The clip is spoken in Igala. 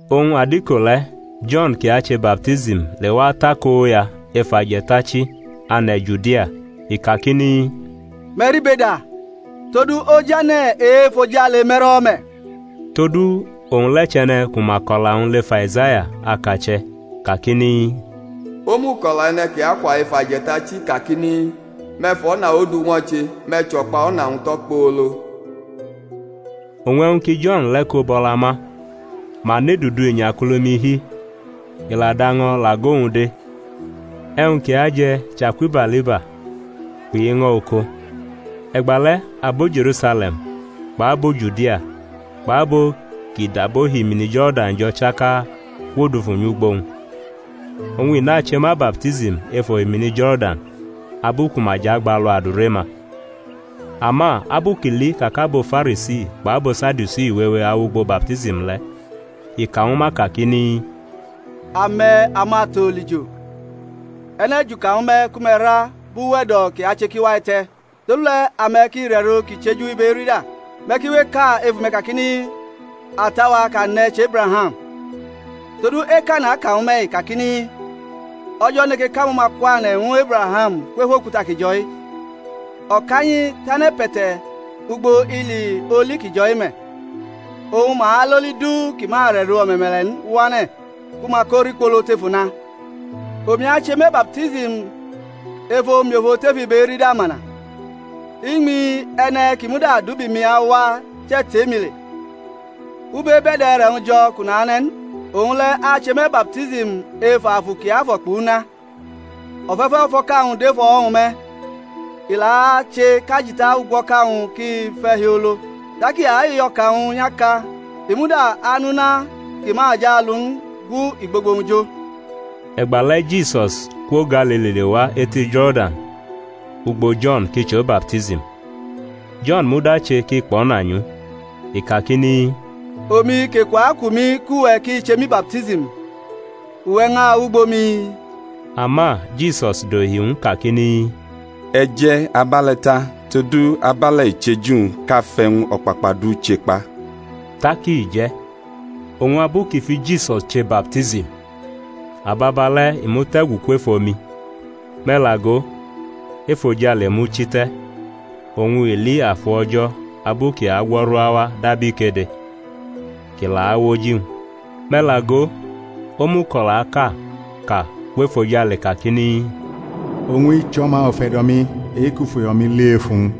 Oñ adiko le̩ Jo̩n, kʼi ache baptism, lewa atakoya ef ajetachi ane̩ Judia. I kakini, Me̩ ribeda, todu ojane̩ e-efojale me̩rʼo̩wo̩ me̩. Todu owñ le̩ chʼe̩ne̩ ku ma kʼo̩la-wñ lef Aizaya akache̩, kakini, Omuko̩la e̩ne̩ kʼi akwa ef aje̩tachi kakini, Me̩ fʼo̩na Ondu ñwo̩che, me̩ chʼo̩kpa o̩na-wñ tʼokpolo. Oñ e̩wñ ki Jo̩n le̩ ko bʼo̩la ma, ma nʼedudu inyakulumi hi, i la dʼaño̩ lʼago-wñ de; e̩wñ kʼi aje̩ chʼakubaliba kpʼiño̩ oko. E̩gbale̩ abo Je̩rusale̩m kpʼabo Judia kpʼabo kʼi dab ohimini Jo̩rdan jo̩ chaka kwodufu nyʼugbo-wñ. Oñ i nache ma baptism ef ohimini Jo̩rdan abu ku ma jʼagbalu adure-ma. Ama abu kʼi li ka kʼabo Farisi kpʼabo Sadiusi wewe awʼugbo baptism le̩, i ka ñwu ma kakini, Ame̩, amato̩ olijo! E̩ne̩ juka ñwu me̩ ku me̩ ra bʼuwe̩do̩ kʼi ache kʼi wa te̩? Todule̩ ame̩ ki rʼe̩ro kʼi chʼeju ibe erida. Me̩ ki we eka ef ume̩ kakini, Ata-wa kʼa ne̩ chʼEbraham; todu eka naka ñwu me̩-i, kakini, O̩jo̩ neke kʼamo̩ma kwane̩ ñwu Ebraham kwef okuta ki jo̩-i. O̩kanyi tʼane̩pe̩te̩ ugbo ili oli ki jo̩-i me̩; oñ ma alʼoli du kʼi ma rʼe̩ro o̩me̩me̩le̩ n wane̩ ku ma ko rikpolo tʼef una. Omi ache me̩ baptism ef omiofo tef ibe erida, mana. Iñmi E̩ne̩ ki muda dʼubi-mi awa chetʼe-mi le, u bebʼe̩da e̩re̩-wñ jo̩ kʼu nane̩ n. Owñ le̩ ache me̩ baptism ef Afu Kiafo̩ kpʼuna. O̩fe̩fe̩ ufo̩ka-wñ dʼef o̩wo̩-wñ me̩, i la ache kʼajita ugwo̩ka-wñ ki fe̩ hiolo. Tak i ayʼo̩ka-wñ nyʼaka; i muda anʼuna ki ma jʼalu n gu igbogbo-wñ jo. E̩gbale̩ Jisus kwo Galili lewa eti Jo̩rdan ugbo Jo̩n kʼi chʼo baptism. Jo̩n muda che kʼi kpo̩na nyʼu, i kakini, Omi kʼeku aku mi kʼuwe̩ ki che mi baptism, uwe̩ ñʼawʼugbo mi? Ama Jisus dohi ñw u kakini, E̩ je̩ abe̩le̩ ta; todu abe̩le̩ i cheju-wñ kʼa fʼe̩wñ o̩kpakpa du chekpa. Tak i je̩. Oñ abu kʼi fʼiJisus che baptism, ababale̩ i mute̩gu kwef omi; me̩ la go, efojale muchite̩, oñ i li Afu O̩jo̩ abu kʼi agwo̩ru awa dab ikede, kʼi la awʼoji-wñ. Me̩ la go, omuko̩laʼka ka kwʼefojale kakini, Owñ-i chʼO̩ma ufe̩do̩-mi e-kʼu fʼuyo̩-mi li ef uwñ.